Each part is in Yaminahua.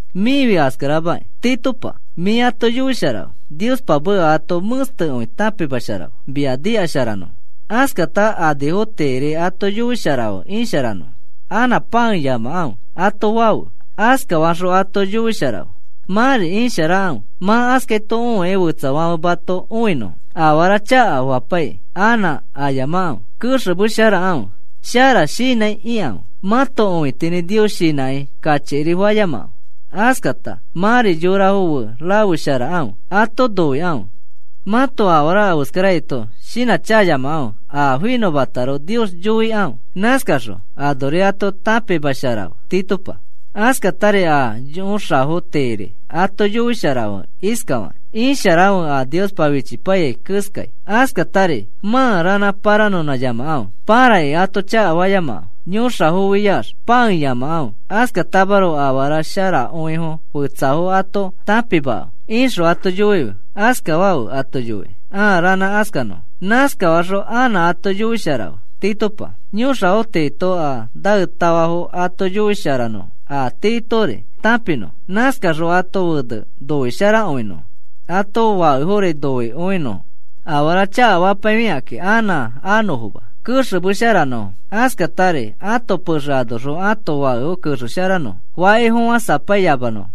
Mĩfi askaramakĩ, Titopa, mĩ ato yoisharafe. Niospa meka ato mẽstekõi tãpimasharafe, mia nikasharanõfo. Askata anifo tiiri ato yoisharafe isharanõfo. “Anã pãeyamakãfe,” ato fafe. Askafaxõ ato yoisharafe: “Mãri isharakãfe mã askaito õikĩ fetsafãfe mato õinõfo. Afara chakafapaikĩ anã ayamakãfe, kexemesharakãfe. Shara shinãi ikãfe. Mãto õitinĩ Nios shinãkĩ kachikiri fayamakãfe. Askata mãri yorafo fe rafesharakãfe. Ato noikãfe. Mãto afara afeskaraito shinãchakayamakãfe, a finõmataroko Nios yoikãfe.” Nãskaxõ anori ato tãpimasharafe, Titopa. Askatari a yõxafo tiiri ato yoisharafe iskafakĩ: “Isharakãfe a Niospa fichipaiyai keskai. Askatari mã ranã paranõnãyamakãfe. Parakĩ ato chakafayamakãfe. Yõxafofiax pãeyamakãfe. Askatamaroko afara sharakõifo fetsafo ato tãpimakãfe,” ixõ ato yoife. Askafafe ato yoikĩ, a ranã askanõfo. Nãskafaxõ anã ato yoisharafe, Titopa, yõxafo tiito a naetafafo ato yoisharanõfo a tiitori tãpinõfo, nãskaxõ ãto fene noisharakõinõfo, ãto fakefori noikõinõfo, afara chakafapaifikakĩ anã anõfoma, kexemesharanõfo, askatari ãto pexe anoxõ ãto fakefo kexesharakõinõfo faki fofãsapaiyamanõfo,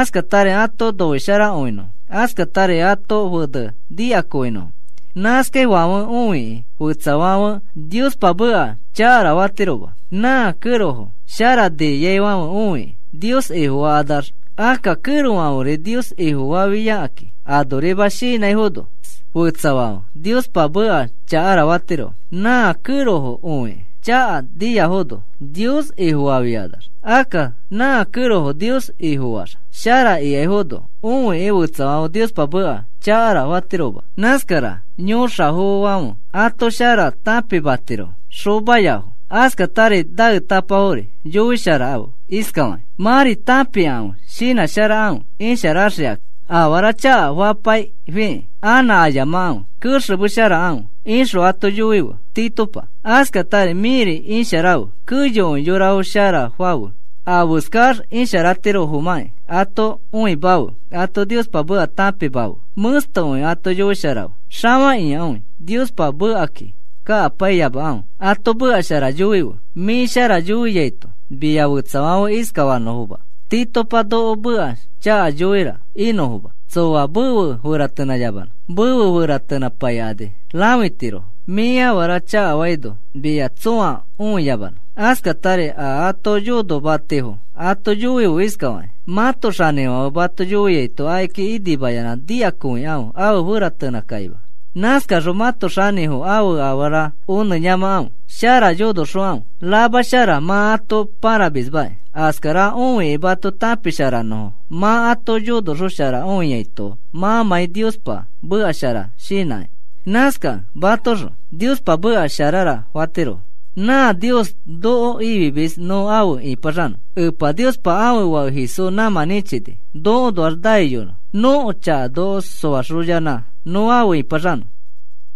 askatari ato noisharakõinõfo, askatari ãto fene nikakõinõfo. Nãskaifãfe õikĩ fetsafãfe Niospa meka chakara fatirofoma, nã kẽrofo shara niaifãfe õikĩ, Nios Ifofakanax. Akka kẽrofãfe Nios Ifofafiakakĩ anorima shinãifono fetsafãfe Niospa meka chakara fatirofo, nã kẽrofo õikĩ, chaka niaifono, Nios Ifofafiakanax. Akka nã kẽrofo Nios Ifofaax shara ikaifono õikĩ fetsafãfe Niospa meka chakara fatirofoma. Nãskara yõxafofofãfe ato shara tãpimatirofo, naetafafo. Askatari naetapafori yoisharafe iskafakĩ: “Mãri tãpikãfe, shinãsharakãfe isharaxikãki. Afara chakafapaifikĩ anã ayamakãfe, kexemesharakãfe,” ixõ ato yoife, Titopa. Askatari mĩri isharafe. Keyokõi yorafo shara fafe. Afeskax isharatirofomãkĩ ato õimafe. Ato Niospa meka tãpimafe, mẽstekõi ato yoisharafe, xafakĩakõi. Niospa mekaki kakapaiyamafe. Ato meka shara yoife. Mĩ shara yoiaito, mia fetsafãfe iskafanõfoma: “Titopa noko meka chaka yoira,” inõfoma. Tsoa mefe feratenãyamanõ. Mefe feratenãpaikani rãfitirofo. Mĩ afara chakafaino mia tsõa õiyamanõ. Askatari a ato yonomatifo ato yoife iskafakĩ: “Mãto xanĩfãfe mato yoiaito akiki inimayanã nikakõikãfe afe feratenãkakima. Nãskaxõ mãto xanĩfo ãfe afara onẽyamakãfe. Shara yonoxokãfe, ramashara mã ato pãramismakĩ. Askara õikĩ mato tãpisharanõfo mã ato yonoxosharakõiaito mãmãi Niospa meka shara shinãkĩ.” Nãskakẽ mãtoõxõ, “Niospa meka sharara,” fatirofo. Nã Nios noko ifimis nõ afe ĩpaxanõ. Epa Niospa ãfe Fake Jesús nãmã nĩchini nokoõnoax naiyonõ nõko chaka noko soaxoyanã nõ afe ĩpaxanõ.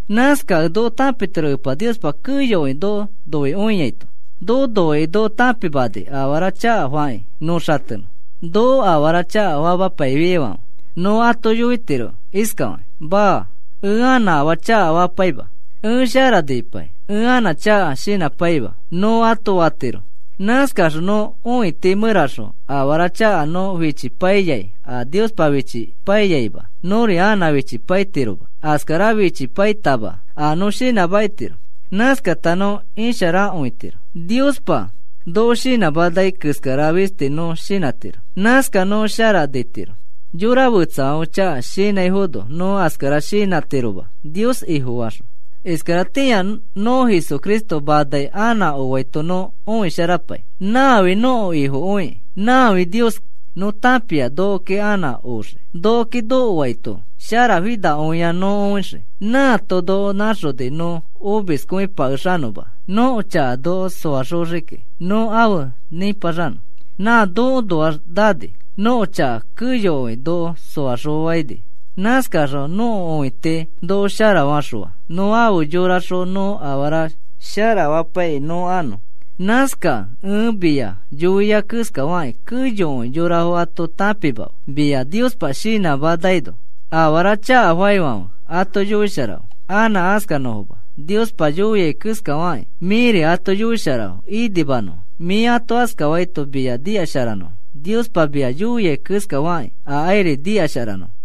Nãskakẽ nõ tãpitiro Epa Niospa keyokõi noko noikõiaito. Noko noikĩ noko tãpimani afara chakafakĩ nõ xatenõ. Noko afara chakafamapaiyaifãfe nõ ato yoitiro iskafakĩ: “Maa, ẽ anã afaa chakafapaima. Ẽ shara nipai, ẽ anã chaka shinãpaima,” nõ ato fatiro. Nãskaxõ nõko õiti mẽraxõ a afara chaka nõ fichipaiyai a Niospa fichipaiyaima, nõri anã fichipaitiroma. Askara fichipaitama a nõ shinãmakitiro. Nãskata nõ isharakõitiro. Niospa noko shinãmanai keskara fisti nõ shinãtiro. Nãskax nõ shara nitiro. Yora fetsafãfe chaka shinãifono nõ askara shinãtiroma, Nios Ifofaxõ. Iskaratĩa nõ Jesucristo manai anã oaito nõ õisharapai. Nãfi nõko Ifokõikĩ. Nãfi Nioski. Nõ tãpia nokoki anã oxii. Nokoki nokoaito sharafinakõia nõ õixii. Nãato noko nãxoni nõ omiskõipakexanõma nõko chaka noko soaxoxiki, nõ afe nĩpaxanõ. Nã nokoõnoax nani. Nõko chaka keyokõi noko soaxõfaini. Nãskaxõ nõko õiti noko sharafaxõa. Nõ afe yoraxõ nõ afara sharafapaikĩ nõ anõ. Nãskakẽ ẽ mia yoiai keskafakĩ keyokõi yorafo ato tãpimafe, mia Niospa shinãmanaino. Afara chakafaifãfe ato yoisharafe, anã askanõfoma. Niospa yoiai keskafakĩ mĩri ato yoisharafe, inimanõfo. Mĩ ato askafaito mia nikasharanõfo Niospa mia yoiai keskarafakĩ akairi nikasharanõfo.